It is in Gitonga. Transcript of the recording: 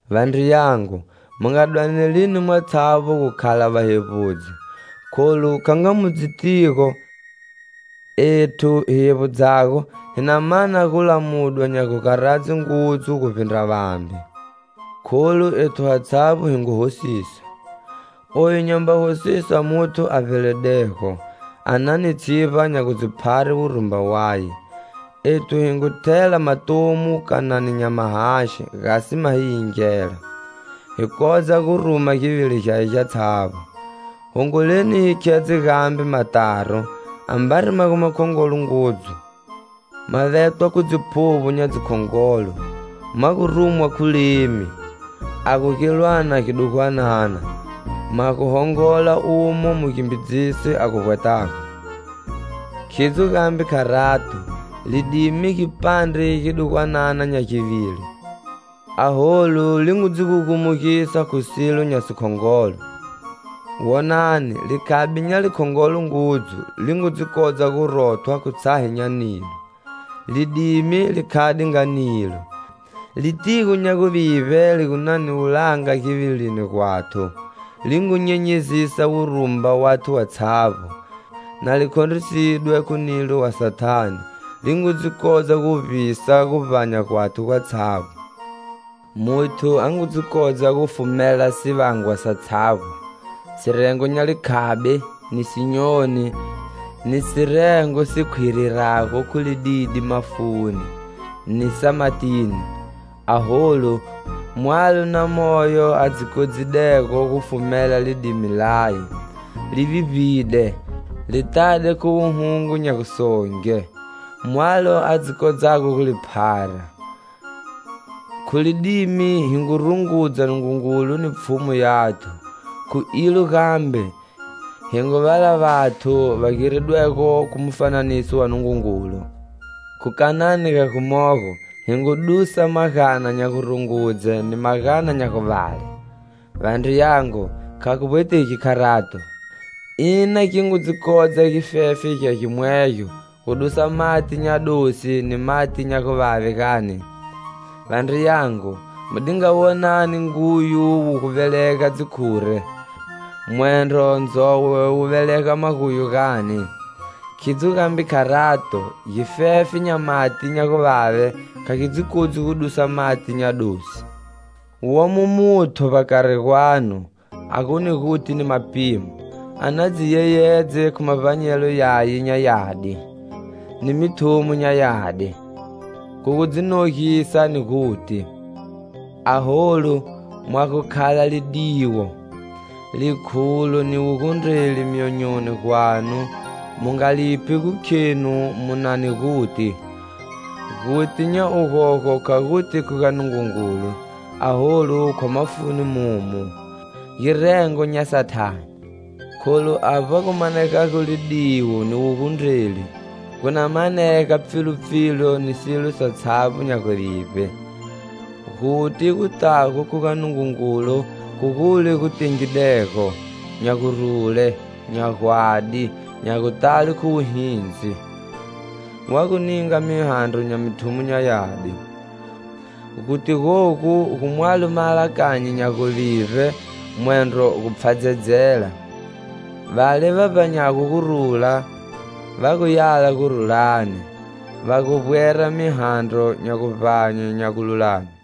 Vandriyangu, mu nga dwaneli mwatshavbo gu khala vahevbudzi, kholu, kha nga mu dzitigo, ethu hi hevbudzago hi na mana gulamudwa nya gugaradze ngudzu guvbindra vambe. Kholu ethu hatshavbo hi ngu hosisa. Oyu nyamba hosisa muthu a vbeledego, a na ni tshivba nya gu dzi phare wurumba waye. Ethu hi ngu thela matomu kanani nya mahaxi gasi ma hi yingela, hi kodza guruma givili gyaye gyatshavbo. Hongoleni hi khedze gambe mataro, ambari ma gu makhongolo ngudzu, ma vetwa khu dziphuvbo nya dzikhongolo, ma gu rumwa khu lemi, a gu gilwana gidugwanana, ma gu hongola umo mugimbidzisi a gu vbwetago. Khidzo gambe kharato, lidimi gipandre gidugwanana nya givili, aholu, li ngu dzi gugumisa khu silo nya sikhongolo. Wonani, likhabi nya likhongolo ngudzu li ngu dzi kodza gu rothwa khu tshahe nya nilo! Lidimi li khade nga nilo. Litigo nya guvivbe li gu na ni wulanga givilini gwathu, li ngu nyenyezisa wurumba wathu watshavbo. Na li khondrisidwe khu nilo wa Sathane, li ngu dzi kodza guvbisa guvbanya gwathu gwatshavbo. Muthu a ngu dzi kodza gu fumela sivangwa satshavbo, sirengo nya likhabi, ni sinyoni, ni sirengo si khwirirago khu lididi mafuni, ni sa matini. Aholu, mwalo na moyo a dzi kodzidego gufumela lidimi laye. Li vivbide, li tade khu wuhungu nya gusonge, mwalo a dzi kodzago gu li phara. Khu lidimi, hi ngu rungudza Nungungulu ni Pfhumu yathu, khu ilo gambe, hi ngu vala vathu va giridwego khu mufananiso wa Nungungulu. Khu kanani ga gumogo, hi ngu dusa magana nya gurungudze ni magana nya guvale. Vandriyangu, kha gu vbwetegi kharato. Ina gi ngu dzi kodza gifefe gya gimwegyo gu dusa mati nya dosi ni mati nya guvave gani? Vandriyangu, mu di nga wonani nguyu wu gu velega dzikhure, mwendro ndzowe wu velega maguyu, gani? Khidzo gambe kharato, gifefe nya mati nya guvave kha gi dzi kodzi gu dusa mati nya dosi. Womo muthu, vbakari gwanu, a gu ni guti ni mapimo! A na dzi yeyedze khu mavbanyelo yaye nya yadi, ni mithumo nya yadi, khu gu dzi nogisa ni guti. Aholu, mwa gu khala lidiwo, likhulo ni wugundreli myonyoni gwanu, mu nga liphi gu khenu mu na ni guti. Guti nya ugogo kha guti khu ga Nungungulu, aholu, khwa mafuni momu. Girengo nya Sathane. Kholu avba gu manegago lidiwo ni wugundreli, gu na manega pfilupfilu ni silo satshavbo nya guvivbe. Guti gutago khu ga Nungungulu khu gule gu tengidego, nya gurule, nya gwadi, nya gutale khu wuhindzi. Wa gu ninga mihandro nya mithumo nya yadi. Guti gogu gu mwalo maalakanyo nya guvivbe, mwendro gu pfhadzedzela. Vale va vbahago gurula, va gu yala gurulani, va gu vbwera mihandro nya guvbanye nya gululame.